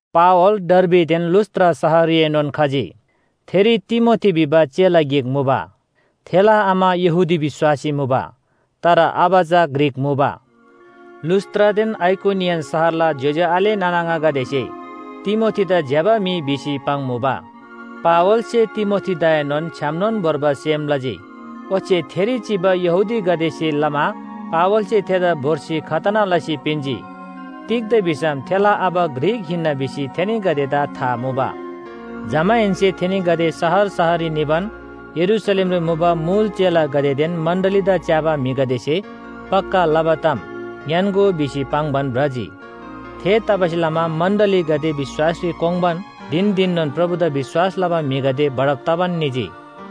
पावल डर्बीदेन लुस्‍त्रा शहररीएनोन खजी। थेरी तिमोथी भिबा चेला गिक मुबा। थेला आमा यहूदी विश्‍वासी मुबा, तर आबा चा ग्रीक मुबा। लुस्‍त्रादेन आइकोनियन शहरला ज्‍योज्‍यो आले नाना आङागदेसे तिमोथीदा ज्‍यबा म्‍हि भिसी पाङ्मुबा। पावलसे तिमोथीदाएनोन छ्‌यामनोन भोर्बा सेम लजी। ओच्‍छे थेरी चिबा यहूदीगदेसे लमा पावलसे थेदा भोर्सी खतना लसी पिन्‍जी। तिग्‍दा भिसम थेला आबा ग्रीक हिन्‍ना भिसी थेनीगदेदा था मुबा। जमाहेन्‍से थेनीगदे शहर शहररी निबान यरूशलेमरी मुबा मुल चेलागदेदेन मण्‍डलीदा च्‍याबा म्‍हिगदेसे पक्‍का लबा ताम ङ्‌यान्‍गो भिसी पाङ्‌बान भ्रजी। थेतबासेलमा मण्‍डलीगदे विश्‍वासरी कोङ्बान धिन धिननोन प्रभुदा विश्‍वास लबा म्‍हिगदे बढब तबान निजी।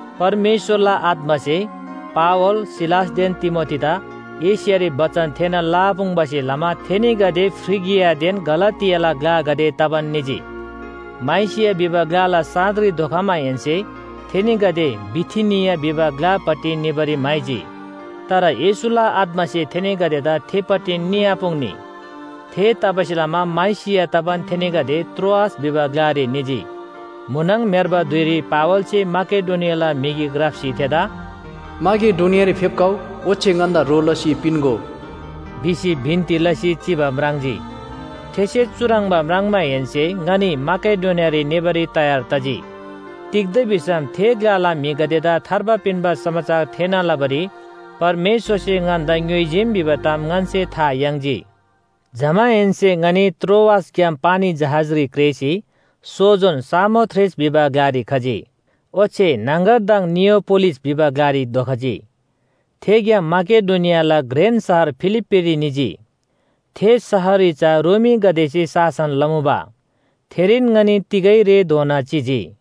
परमेश्‍वरला आत्‍मासे पावल, सिलासदेन तिमोथीदा एशियारी बचन थेःना लआपुङ्‌बासे लमा थेनीगदे फ्रिगियादेन गलातियाला ग्‍लागदे तबान निजी। माइसिया भिबा ग्‍लाला साँधरी धोखमाहेन्‍से थेनीगदे बिथिनिया भिबा ग्‍लापट्टि निबारी म्‍हाइजी। तर येशूला आत्‍मासे थेनीगदेदा थेपट्टि निआपुङ्‌नी। थेतबासेलमा माइसिया तबान थेनीगदे त्रोआस भिबा ग्‍लारी निजी। म्‍हुनङ म्‍हेर्बा धुइरी पावलसे माकेडोनियाला म्‍हि गिक राप्‍सी थेदा “माकेडोनियारी फेप्‍खउ ओच्‍छे ङन्‍दा ह्रो लसी पिन्‍गो” भिसी बिन्‍ती लसी चिबा म्राङ्जी। थेसे चुह्रङ्बा म्राङ्माहेन्‍से ङनी माकेडोनियारी निबारी तयार तजी। तिग्‍दा भिसम थे ग्‍लाला म्‍हिगदेदा थार्बा पिन्‍बा समाचार थेःना लबारी परमेश्‍वरसे ङन्‍दा ङ्‌योइजीम भिबा ताम ङन्‍से था याङ्जी। जमाहेन्‍से ङनी त्रोआसग्‍याम पानी जहाजरी क्रेःसी सोजोन सामोथ्रेस भिबा ग्‍लारी खजी, ओच्‍छे न्‍हङगरदङ नियापोलिस भिबा ग्‍लारी धोखजी। थेग्‍याम माकेडोनियाला घ्रेन शहर फिलिप्‍पीरी निजी। थे शहररी चा रोमीगदेसे शासन लमुबा। थेरीन ङनी तिगै रेधोना चिजी।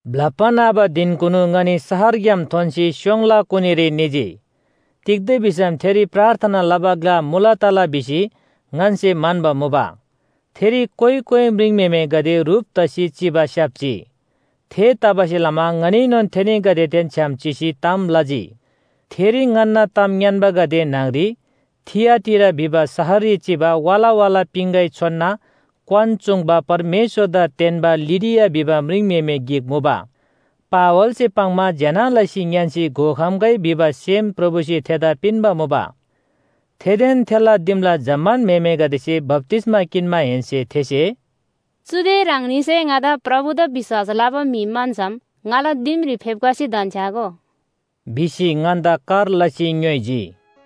ब्‍लप्‍बा न्‍हबा धिनकुनु ङनी शहरग्‍याम थोन्‍सी स्‍योङला कुनीरी निजी। तिग्‍दा भिसम थेरी प्रार्थना लबा ग्‍ला मुला तला भिसी ङन्‍से म्‍हन्‍बा मुबा, थेरी कोइ कोइ म्रिङम्‍हेमेगदे ह्रुप तसी चिबा स्‍याप्‍जी। थेतबासेलमा ङनीएनोन थेनीगदेदेन छ्‌याम चिसी ताम लजी। थेरी ङन्‍ना ताम ङ्‌यान्‍बागदे न्‍हङरी थिआटीरा भिबा शहररी चिबा वाला वाला पिङगै छोनना क्‍वान चूङ्बा परमेश्‍वरदा तेन्‍बा लिडिया भिबा म्रिङम्‍हेमे गिक मुबा। पावलसे पाङ्‌मा ज्‍यना लसी ङ्‌यान्‍सी घोखम्‍गै भिबा सेम प्रभुसे थेदा पिन्‍बा मुबा। थेदेन थेला दिमला जम्‍मान म्‍हेमेगदेसे बप्‍तिस्‍मा किन्‍माहेन्‍से थेसे “चुदे ह्राङनीसे ङादा प्रभुदा विश्‍वास लबा म्‍हि म्‍हन्‍सम ङाला दिमरी फेप्‍खसी धन्‍छ्‌यागो” भिसी ङन्‍दा कर लसी ङ्‌योइजी।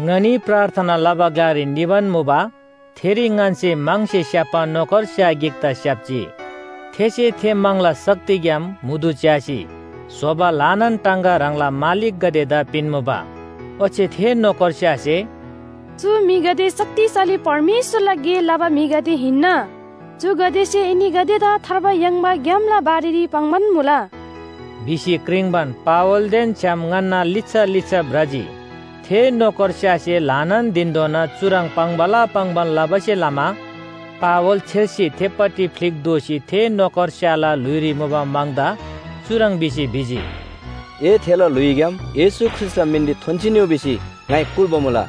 ङनी प्रार्थना लबा ग्‍लारी निबान मुबा, थेरी ङन्‍से म्‍हङसे स्‍याप्‍बा नोकर स्‍या गिकदा स्‍याप्‍जी, थेसे थे म्‍हङला शक्तिग्‍याम म्‍हुदु च्‍यासी स्‍होबा ल्‍हानान टाङगा ह्राङला मालिकगदेदा पिन्‍मुबा। ओच्‍छे थे नोकरस्‍यासे “चु म्‍हिगदे शक्तिशाली परमेश्‍वरला गे लबा म्‍हिगदे हिन्‍ना। चुगदेसे एनीगदेदा थार्बा याङ्बा ग्‍यामला बारेरी पाङ्‌बान मुला” भिसी क्रिङ्‌बान पावलदेन छ्‌याम ङन्‍ना लिच्‍छा लिच्‍छा भ्रजी। थे नोकरस्‍यासे ल्‍हानान धिनधोना चुह्रङ् पाङ्‌बाला पाङ्‌बान लबासे लमा पावल छेर्सी थेपट्टि फ्‍लिक दोःसी थे नोकरस्‍याला ल्‍हुइरी मुबा म्‍हङदा चुह्रङ् भिसी भिजी, “ए थेला ल्‍हुइग्‍याम येशू ख्रीष्‍टला मिनरी थोन्‍सी निउ भिसी ङाइ कुल्‍बा मुला।”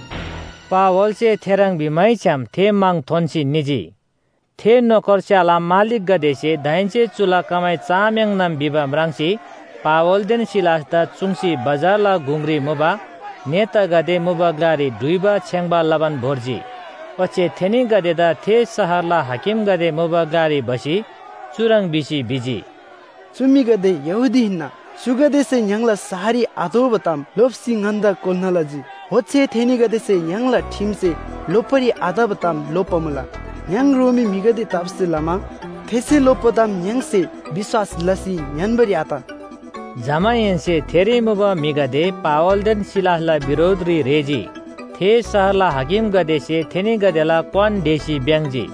पावलसे थेह्रङ् भिमैछ्‌याम थे म्‍हङ थोन्‍सी निजी। थे नोकरस्‍याला मालिकगदेसे दाहेन्‍से चुला कमाइ चआम्‍याङनम भिबा म्राङ्सी पावलदेन सिलासदा चुङ्सी बजारला गुङरी मुबा नेतागदे मुबा ग्‍लारी डुइबा छेङ्‌बा लबान भोर्जी। ओच्‍छे थेनीगदेदा थे शहरला हाकिमगदे मुबा ग्‍लारी भसी चुह्रङ् भिसी भिजी, “चु म्‍हिगदे यहूदी हिन्‍ना, चुगदेसे य्‍हाङला शहररी आतोःबा ताम लोप्‍सी ङन्‍दा कोल्‍ना लजी। ओच्‍छे थेनीगदेसे य्‍हाङला ठिमसे लोप्‍बारी आतबा ताम लोप्‍बा मुला य्‍हाङ रोमी म्‍हिगदे तबासे लमा थेन्‍से लोप्‍बा ताम य्‍हाङसे विश्‍वास लसी ङ्‌यान्‍बारी आत।” जमाहेन्‍से थेरी मुबा म्‍हिगदे पावलदेन सिलासला बिरोधरी रेःजी। थे शहरला हाकिमगदेसे थेनीगदेला क्‍वान ढेसी भ्‍याङ्‍जी,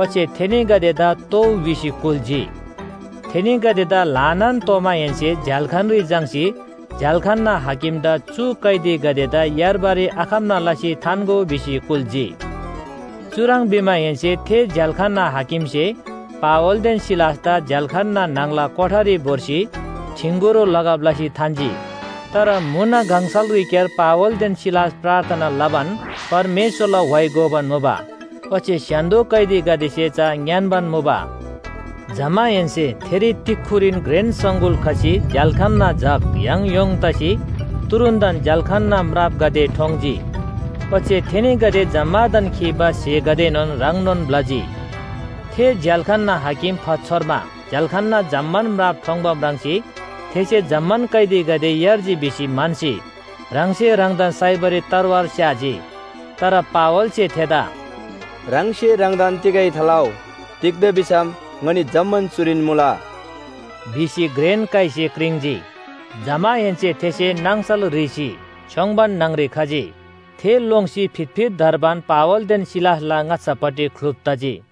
ओच्‍छे थेनीगदेदा तोउ भिसी कुल्‍जी। थेनीगदेदा ल्‍हानान तोमाहेन्‍से झ्‍याल्‍खानरी झाङ्‌सी झ्‍याल्‍खानना हाकिमदा चु कैदीगदेदा यार्बारी आखम्‍ना लसी थान्‍गो भिसी कुल्‍जी। चुह्रङ् भिमाहेन्‍से थे झ्‍याल्‍खानना हाकिमसे पावलदेन सिलासदा झ्‍याल्‍खानना न्‍हङला कोठारी भोर्सी ठिँगुरो लगब लसी थान्‍जी। तर म्‍हुन गङसलरीक्‍यार पावलदेन सिलास प्रार्थना लबान परमेश्‍वरला व्‍हाइ गोबान मुबा, ओच्‍छे स्‍य्‍हान्‍दो कैदीगदेसे चा ङ्‌यान्‍बान मुबा। जमाहेन्‍से थेरी तिक्‍खुरीन घ्रेन सङगुल खसी झ्‍याल्‍खानना जग य्‍हङ य्‍होङ तसी तुरुन्‍तन झ्‍याल्‍खानना म्रापगदे ठोङ्‌जी। ओच्‍छे थेनीगदे जम्‍मादान खीबा स्‍हेगदेएनोन ह्रङ्नोन ब्‍लजी। थे झ्‍याल्‍खानना हाकिम फातछोर्मा झ्‍याल्‍खानना जम्‍मान म्राप ठोङ्‌बा म्राङ्सी थेसे जम्‍मान कैदीगदे यार्जी भिसी म्‍हन्‍सी ह्राङसे ह्राङदान साइबारी तरवार स्‍याजी। तर पावलसे थेदा “ह्राङसे ह्राङदान तिगै थालउ, तिग्‍दा भिसम ङनी जम्‍मान चुरीन मुला” भिसी घ्रेन काइसे क्रिङ्‌जी। जमाहेन्‍से थेसे नाङसल ह्रीसी छ्‌योङ्बान न्‍हङरी खजी, थे लोङ्सी फितफित धर्बान पावलदेन सिलासला ङाच्‍छापट्टि ख्‍लुप तजी।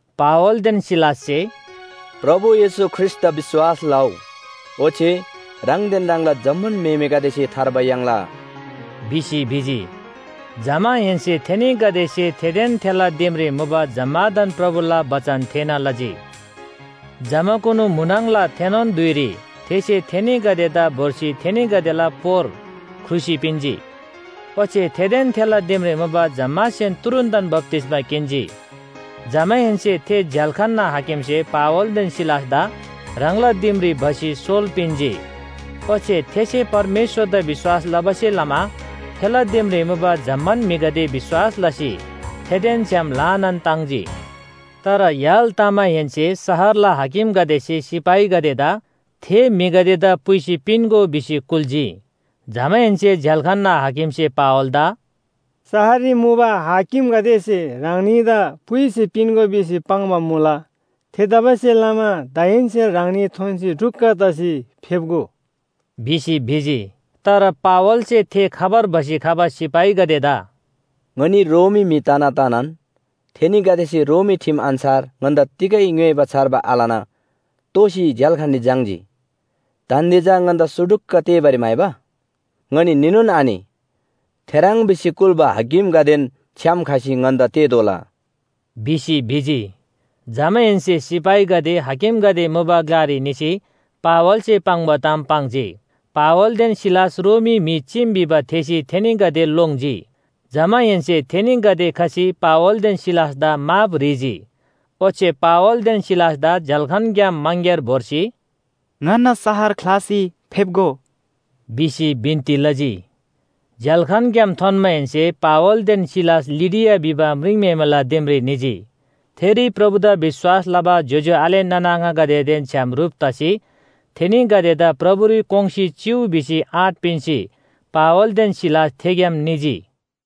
पावलदेन सिलाससे “प्रभु येशू ख्रीष्‍टदा विश्‍वास लउ, ओच्‍छे ह्राङदेन ह्राङला जम्‍मान म्‍हेमेगदेसे थार्बा याङ्ला” भिसी भिजी। जमाहेन्‍से थेनीगदेसे थेदेन थेला दिमरी मुबा जम्‍मादान प्रभुला बचन थेःना लजी। जमाकुनु म्‍हुनङला थेनोन धुइरी थेसे थेनीगदेदा भोर्सी थेनीगदेला पोर ख्रुसी पिन्‍जी। ओच्‍छे थेदेन थेला दिमरी मुबा जम्‍मासेन तुरुन्‍तन बप्‍तिस्‍मा किन्‍जी। जमाहेन्‍से थे झ्‍याल्‍खानना हाकिमसे पावलदेन सिलासदा ह्राङला दिमरी भसी सोल पिन्‍जी। ओच्‍छे थेसे परमेश्‍वरदा विश्‍वास लबासे लमा थेला दिमरी मुबा जम्‍मान म्‍हिगदे विश्‍वास लसी थेदेन छ्‌याम ल्‍हानान ताङ्जी। तर य्‍हाल तमाहेन्‍से शहरला हाकिमगदेसे सिपाहीगदेदा “थे म्‍हिगदेदा पुइसी पिन्‍गो” भिसी कुल्‍जी। जमाहेन्‍से झ्‍याल्‍खानना हाकिमसे पावलदा “शहररी मुबा हाकिमगदेसे ह्राङनीदा पुइसी पिन्‍गो भिसी पाङ्बा मुला। थेतबासेलमा दाहेन्‍से ह्राङनी थोन्‍सी ढुक्‍क तसी फेप्‍गो” भिसी भिजी। तर पावलसे थे खबर भसी खबा सिपाहीगदेदा “ङनी रोमी म्‍हि तना तनान थेनीगदेसे रोमी ठिम अन्‍छार ङन्‍दा तिगै ङ्‌योइबा छार्बा आलना तोसी झ्‍याल्‍खानरी झाङ्‌जी। दान्‍दे चा ङन्‍दा सुटुक्‍क तेःबारी म्‍हाइबा? ङनी नीनोन आनि। थेह्रङ् भिसी कुल्‍बा हाकिमगदेन छ्‌याम खसी ङन्‍दा तेःतोःला” भिसी भिजी। जमाहेन्‍से सिपाहीगदे हाकिमगदे मुबा ग्‍लारी निसी पावलसे पाङ्बा ताम पाङ्जी। पावलदेन सिलास रोमी म्‍हि चीम भिबा थेःसी थेनीगदे लोङ्जी। जमाहेन्‍से थेनीगदे खसी पावलदेन सिलासदा माफ ह्रीजी, ओच्‍छे पावलदेन सिलासदा झ्‍याल्‍खानग्‍याम मङग्‍यार भोर्सी, “ङन्‍ना शहर ख्‍लासी फेप्‍गो” भिसी बिन्‍ती लजी। झ्‍याल्‍खानग्‍याम थोन्‍माहेन्‍से पावलदेन सिलास लिडिया भिबा म्रिङम्‍हेमेला दिमरी निजी। थेरी प्रभुदा विश्‍वास लबा ज्‍योज्‍यो आले नाना आङागदेदेन छ्‌याम ह्रुप तसी थेनीगदेदा प्रभुरी कोङ्‌सी चिउ भिसी आँट पिन्‍सी पावलदेन सिलास थेग्‍याम निजी।